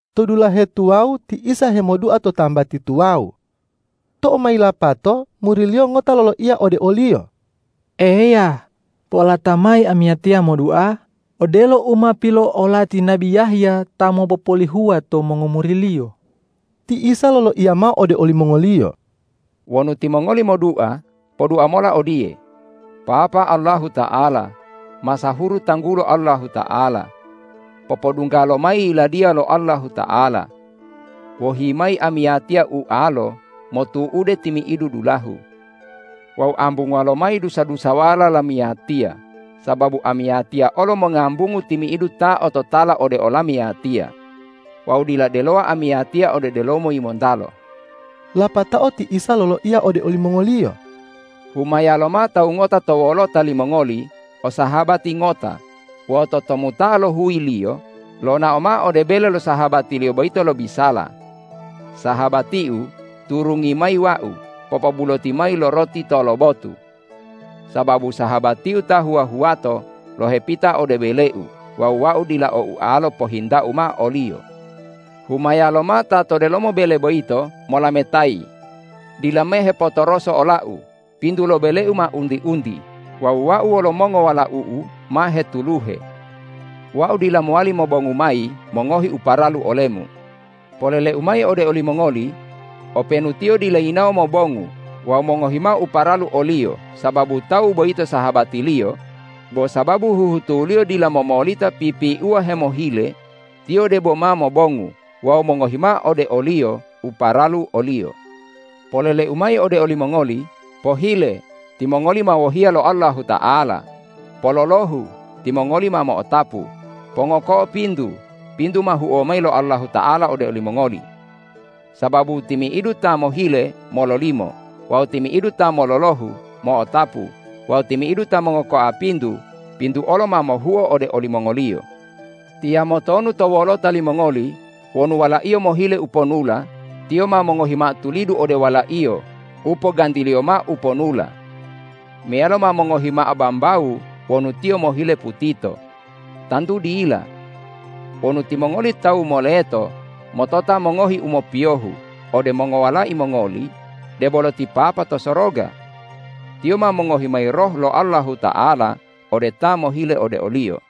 To dulahe tuwawu ti Isa hemodua to tambati tuwawu. Tou ma yilapato muri-Liyo ngota loloiya ode o-Liyo,”Eya, po'olata mayi amiyatiya modua odelo u ma pilo'olati nabi Yahya ta mopopolihuwa to mongomuriliyo.” Ti Isa loloiya mao ode olimongoliyo,”Wonu timongoli modua, podua mola odiye, ’Papa Allahuta'ala, masahuru tanggulo Allahuta'ala. Popodungga lomayi Yiladiya lo Allahuta'ala. Wohi mayi amiyatiya ualo motu'ude timi'idu dulahu. Wawu ambunguwa lomayi dusa-dusawala lamiyatiya, sababu amiyatiya olo mongambungu timi'idu ta ototala ode olamiyatiya. Wawu dila delowa amiyatiya ode delomo yimontalo.’” Lapatao ti Isa loloiya ode olimongoliyo,”Humaya lomao tawu ngota to wolota limongoli o sahabati ngota wawu totomuta'a lo huyiliyo lonao mao ode bele lo sahabatiliyo boyito lobisala, ’Sahabatiu, turungi mayi wau popobuloti mayi lo roti tolobotu, sababu sahabatiu ta huwa-huwato lohepita ode beleu wawu wau dila o ualo pohintau mao oliyo!’ Humaya lomao ta to delomo bele boyito molametayi, ’Dila mehepotoroso olau, pintu lo beleu ma unti-unti wawu wau wolo mongowalau'u ma hetuluhe. Wau dila mowali mobongu mayi mongohi u paralu olemu.’ Polele-U mayi ode olimongoli: Openu tiyo dila yinawo mobongu wawu mongohi mao u paralu oliyo sababu tawu boyito sahabatiliyo; bo sababu huhutuliyo dila momolita pipiuwa hemohile, tiyo debo ma mobongu wawu mongohi mao ode oliyo u paralu oliyo. Polele-U mayi ode olimongoli: Pohile, timongoli ma wohiya lo Allahuta'ala; pololohu, timongoli ma mo'otapu; pongoko'o pintu, pintu ma huo mayi lo Allahuta'ala ode olimongoli. Sababu timi'idu ta mohile, mololimo wawu timi'idu ta mololohu, mo'otapu wawu timi'idu ta mongokoa pintu, pintu olo ma mohuo ode olimongoliyo. Tiyamo tonu to wolota limongoli, wonu walaiyo mohile uponula, tiyo ma mongohi mao tulidu ode walaiyo u pogantiliyo mao uponula? Meyalo ma mongohi mao bambawu wonu tiyo mohile putito? Tantu dila! Wonu timongoli tawu moleto motota mongohi u mopiyohu ode mongowalai mongoli, debolo ti Papa to soroga! Tiyo ma mongohi mayi Roh lo Allahuta'ala ode ta mohile ode o-Liyo!”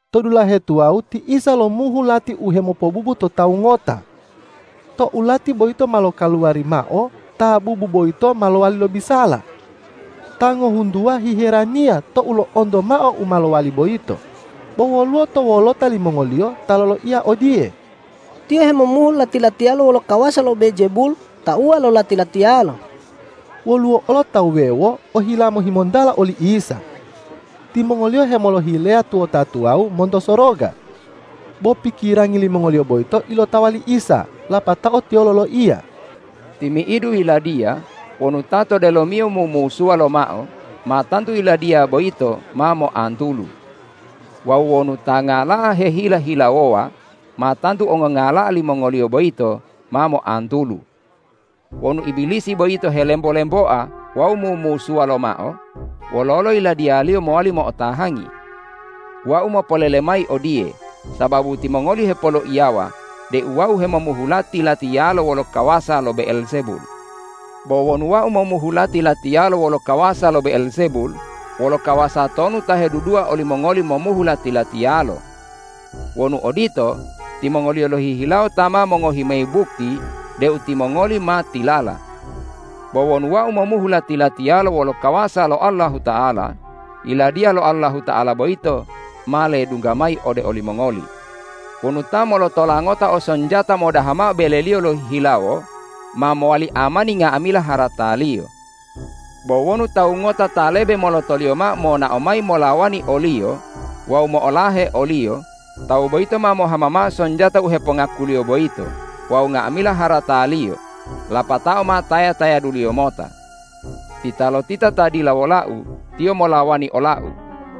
To dulahe tuwawu ti Isa lomuhu lati u hemopobubu to tawu ngota. Tou lati boyito ma lokaluwari mao, ta bubu boyito ma lowali lobisala. Ta ngohuntuwa hiheraniya tou lo'onto mao u ma lowali boyito. Bo woluwo to wolota limongoliyo ta loloiya odiye,”Tiyo hemomuhu lati-latiyalo wolo kawasa lo Be'eljebul tauwa lo lati-latiyalo.” Woluwo olo tawu wuwewo ohila mohimontala oli Isa. Timongoliyo hemolohileya tuwota tuwawu monto soroga. Bo pikirangi limongoliyo boyito ilotawa li Isa, lapatao Tiyo loloiya,”Timi'idu yiladiya wonu ta to delomiyo mumusuwa lomao, ma tantu yiladiya boyito ma moantulu. Wawu wonu ta ngala'a hehila-hilawowa, ma tantu ongongala'a limongoliyo boyito ma moantulu. Wonu Ibilisi boyito helembo-lemboa wawu mumusuwa lomao, wololo yiladiyaliyo mowali mo'otahangi? Wau mopolele mayi odiye sababu timongoli hepoloiyawa deu Wau hemomuhu lati-latiyalo wolo kawasa lo Be'eljebul. Bo wonu Wau momuhu lati-latiyalo wolo kawasa lo Be'eljebul, wolo kawasa tonu ta hedudua olimongoli momuhu lati-latiyalo? Wonu odito, timongoliyo lohihilawo ta ma mongohi mayi bukti deu timongoli ma tilala. Bo wonu Wau momuhu lati-latiyalo wolo kawasa lo Allahuta'ala, Yiladiya lo Allahuta'ala boyito ma ledungga mayi ode olimongoli. Wonu ta molotola ngota o sonjata modaha mao beleliyo lohihilawo, ma mowali amani nga'amila harataliyo. Bo wonu tawu ngota ta lebe molotoliyo mao monao mayi molawani oliyo wawu mo'olahe oliyo, tawu boyito ma mohama mao sonjata u hepongakuliyo boyito wawu nga'amila harataliyo lapatao ma taya-tayaduliyo mota. Titalotita ta dila wola-U, tiyo molawani ola-U;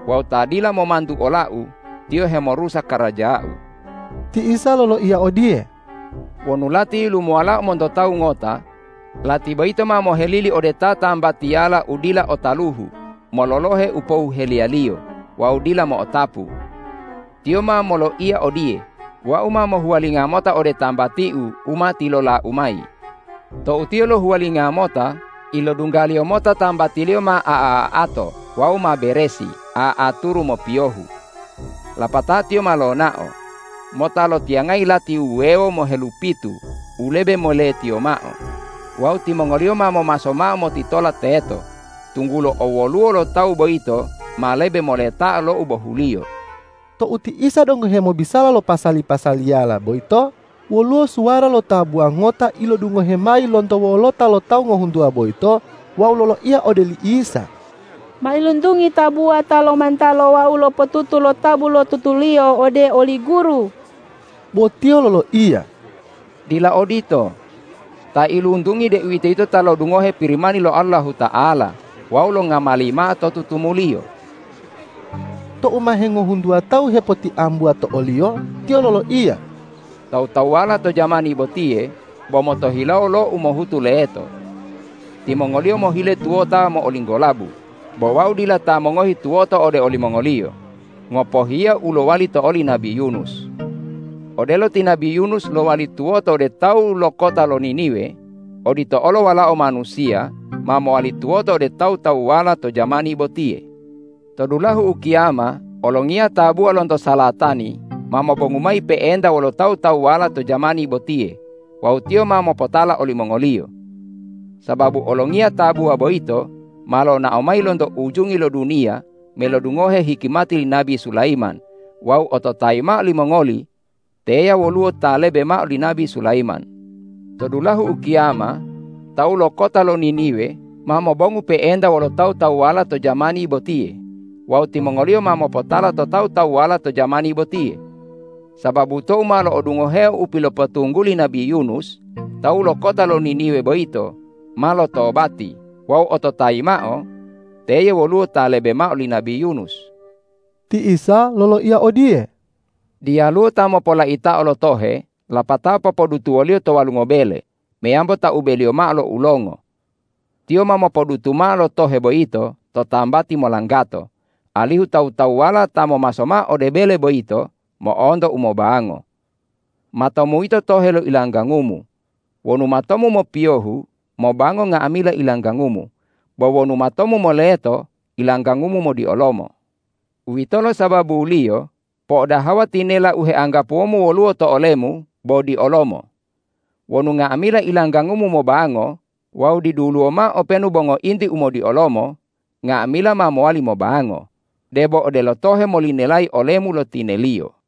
wawu ta dila momantu ola-U, tiyo hemorusa karaja-U!” Ti Isa loloiya odiye,”Wonu lati yilumuwalao monto tawu ngota, lati boyito ma mohelili ode tatambatiyala u dila o taluhu mololohe u pohuheliyaliyo wawu dila mo'otapu. Tiyo ma moloiya odiye, ’Wau ma mohuwalinga mota ode tambatiu u ma tilolau mayi!’ Tou tiyo lohuwalinga mota, ilodunggaliyo mota tambatiliyo ma a'a-a'ato wawu ma beresi a'aturu mopiyohu. Lapatao tiyo ma lonao mota lotiyangayi lati wuwewo mohelupitu u lebe moletiyo mao wawu timongoliyo ma momaso mao motitola teto, tunggulo owoluwo lo tawu boyito ma lebe moletao lo u bohuliyo.” Tou ti Isa donggo hemobisala lo pasa-pasaliyala boyito, woluwo suwara lo tabuwa ngota ilodungohe mayi lonto wolota lo tawu ngohuntuwa boyito wawu loloiya ode li Isa,”Mailuntungi tabuwa ta lomantalo wawu lopotutu lo tabu lo tutuliyo ode oli Guru.” Bo Tiyo loloiya,”Dila odito. Ta iluntungi, deuwitoyito ta lodungohe Pirimani lo Allahuta'ala wawu longamali mao to tutumuliyo.” Tou ma hengohuntuwa tawu hepotiambuwa to o-Liyo, Tiyo loloiya,”Tawu-tawuwala to jamani botiye bo motohilawo lo umohutu leto. Timongoliyo mohile tuwota mo'olinggolabu, bo Wau dila ta mongohi tuwoto ode olimongoliyo, ngopohiya u lowali to oli nabi Yunus. Odelo ti nabi Yunus lowali tuwoto ode tawu lo kota lo Niniwe, odito olo Walao Manusiya ma mowali tuwoto ode tawu-tawuwala to jamani botiye. To dulahu ukiyama olongiya tabua lonto salatani ma mobongu mayi pe'enta wolo tawu-tawuwala to jamani botiye wawu tiyo ma mopotala olimongoliyo. Sababu olongiya tabuwa boyito ma lonao mayi lonto ujungi lo duniya melodungohe hikimati li nabi Sulayiman wawu ototayi mao limongoli: Teya woluwo Ta lebe mao li nabi Sulayiman! To dulahu ukiyama tawu lo kota lo Niniwe ma mobongu pe'enta wolo tawu-tawuwala to jamani botiye wawu timongoliyo ma mopotala to tawu-tawuwala to jamani botiye. Sababu tou ma lodungoheo u pilopotungguli nabi Yunus, tawu lo kota lo Niniwe boyito ma lotobati wawu ototayi mao: Teye woluwo Ta lebe mao li nabi Yunus!” Ti Isa loloiya odiye,”Diyaluwo ta mopolaitao lo tohe lapatao popodutuwoliyo to walungo bele meyambo taubeliyo mao lo ulongo. Tiyo ma mopodutu mao lo tohe boyito to tambati molanggato, alihu tawu-tawuwala ta momaso mao ode bele boyito mo'onto umobango. Matomu yito tohe lo ilanggangumu. Wonu matomu mopiyohu, mobango nga'amila ilanggangumu; bo wonu matomu moleto, ilanggangumu modiolomo. Uwitolo sababuliyo po'odahawa tinela u heanggapuwomu woluwo to olemu bo diolomo. Wonu nga'amila ilanggangumu mobango wawu diduluwo mao openu bo ngointi umodiolomo, nga'amila ma mowali mobango, debo odelo tohe molinelayi olemu lo tineliyo.”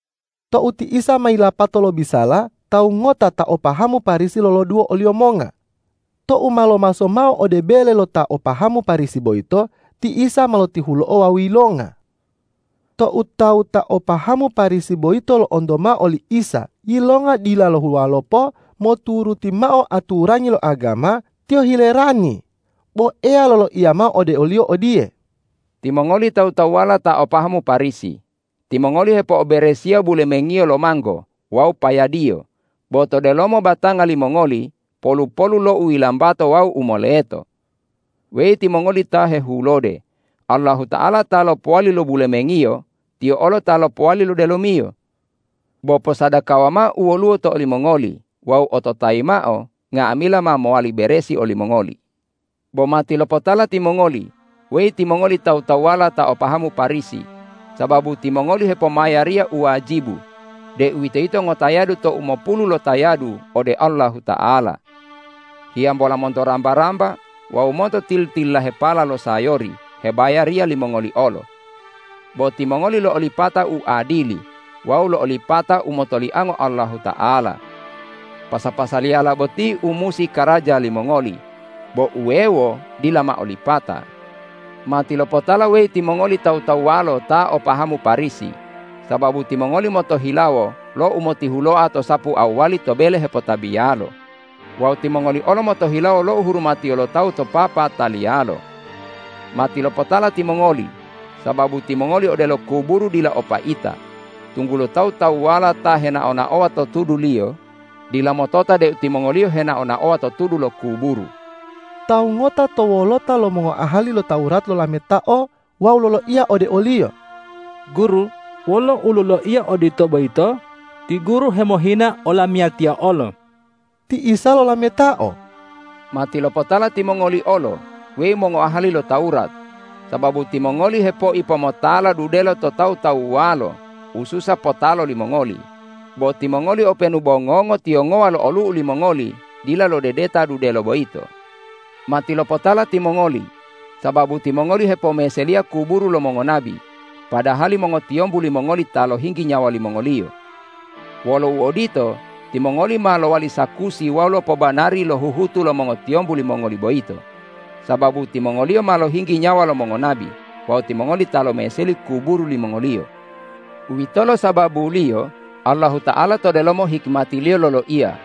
Tou ti Isa ma yilapato lobisala, tawu ngota ta o pahamu Parisi loloduwo o-Liyo monga. Tou ma lomaso mao ode bele lo ta o pahamu Parisi boyito, ti Isa ma lotihulo'o wawu yilonga. Tou tawu ta o pahamu Parisi boyito lo'onto mao oli Isa yilonga dila lohuwalopo moturuti mao aturangi lo agama, tiyo hilerani. Bo Eya loloiya mao ode oliyo odiye,”Timongoli tawu-tawuwala ta o pahamu Parisi, timongoli hepo'oberesiya bulemengiyo lo manggo wawu payadiyo, bo to delomo batanga limongoli polu-polu lo u yilambato wawu u moleto. Weyi timongoli ta hehulode, Allahuta'ala ta lopowali lo bulemengiyo, Tiyo olo ta lopowali lo delomiyo. Bo posadakawa mao u woluwo to olimongoli wawu ototayi mao: Nga'amila ma mowali beresi olimongoli. Bo matilopotala timongoli, weyi timongoli tawu-tawuwala ta o pahamu Parisi, sababu timongoli hepomayariya u wajibu, deuwitoyito ngotayadu to umopulu lotayadu ode Allahuta'ala. Hiyambola monto ramba-ramba wawu monto tili-tililahepala lo sayori hebayariya limongoli olo. Bo timongoli lo'olipata uadili wawu lo'olipata umotoliango Allahuta'ala. Pasa-pasaliyala boti u musi karaja limongoli, bo uwewo dila mao lipata. Matilopotala, weyi timongoli tawu-tawuwalo ta o pahamu Parisi, sababu timongoli motohilawo lo umotihuloa to sapu to awwali to bele hepotabiyalo wawu timongoli olo motohilawo lo uhurumatiyo lo tawu to papataliyalo. Matilopotala timongoli, sababu timongoli odelo kuburu dila o paita, tunggulo tawu-tawuwala ta henao-naowa to tuduliyo, dila motota deu timongoliyo henao-naowa to tudu lo kuburu.” Tawu ngota to wolota lo mongoahali lo Tawurat lolametao wawu loloiya ode o-Liyo,”Guru, wolo uloloiya odito boyito ti Guru hemohina olamiyatiya olo.” Ti Isa lolametao,”Matilopotala timongoli olo, weyi mongoahali lo Tawurat, sababu timongoli hepoipomotala dudelo to tawu-tawuwalo ususa potalo limongoliyo, bo timongoli openu bo ngongo tiyongowa lo olu'u limongoli dila lodedeta dudelo boyito. Matilopotala timongoli, sababu timongoli hepomeseliya kuburu lo mongonabi, padahali mongotiyombu limongoli ta lohinggi nyawa limongoliyo. Wolo uodito, timongoli ma lowali sakusi wawu lopobanari lo huhutu lo mongotiyombu limongoli boyito, sababu timongoliyo ma lohinggi nyawa lo mongonabi wawu timongoli ta lomeseli kuburu limongoliyo. Uwitolo sababuliyo Allahuta'ala to delomo hikimati-Liyo loloiya,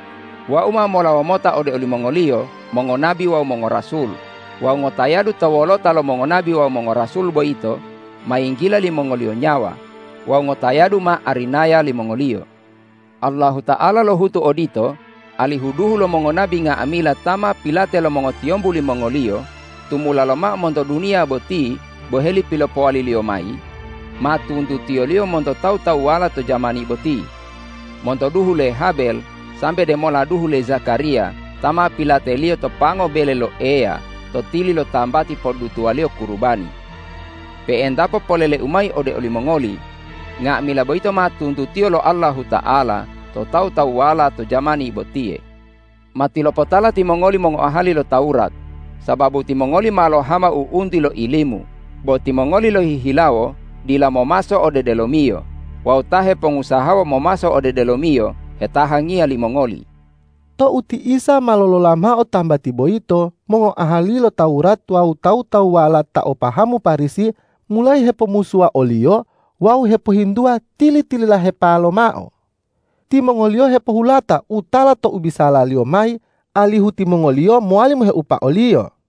’Wau ma molawo mota ode olimongoliyo mongonabi wawu mongorasul wawu ngotayadu to wolota lo mongonabi wawu mongorasul boyito ma yinggila limongoliyo nyawa wawu ngotayadu ma arinaya limongoliyo!’ Allahuta'ala lohutu odito, alihu duhu lo mongonabi nga'amila ta ma pilate lo mongotiyombu limongoliyo tumula lomao monto duniya boti boheli pilopowali-Liyo mayi, ma tuntutiyo-Liyo monto tawu-tawuwala to jamani boti, monto duhu le Habel sambe demola duhu le Zakariya ta ma pilateliyo to pango bele lo Eya to tili lo tambati podutuwaliyo kurubani. Pe'entapo polele-U mayi ode olimongoli: Nga'amila boyito ma tuntutiyo lo Allahuta'ala to tawu-tawuwala to jamani botiye. Matilopotala timongoli mongoahali lo Tawurat, sababu timongoli ma lohama u'unti lo ilimu, bo timongoli lohihilawo dila momaso ode delomiyo wawu ta hepongusahawa momaso ode delomiyo hetahangiya limongoli.” Tou ti Isa ma lolola mao tambati boyito, mongoahali lo Tawurat wawu tawu-tawuwala ta o pahamu Parisi mulayi hepomusuwa o-Liyo wawu hepohintuwa tili-tililahepa lomao. Timongoliyo hepohulata u tala to u bisala-Liyo mayi, alihu timongoliyo mowali moheupa o-Liyo.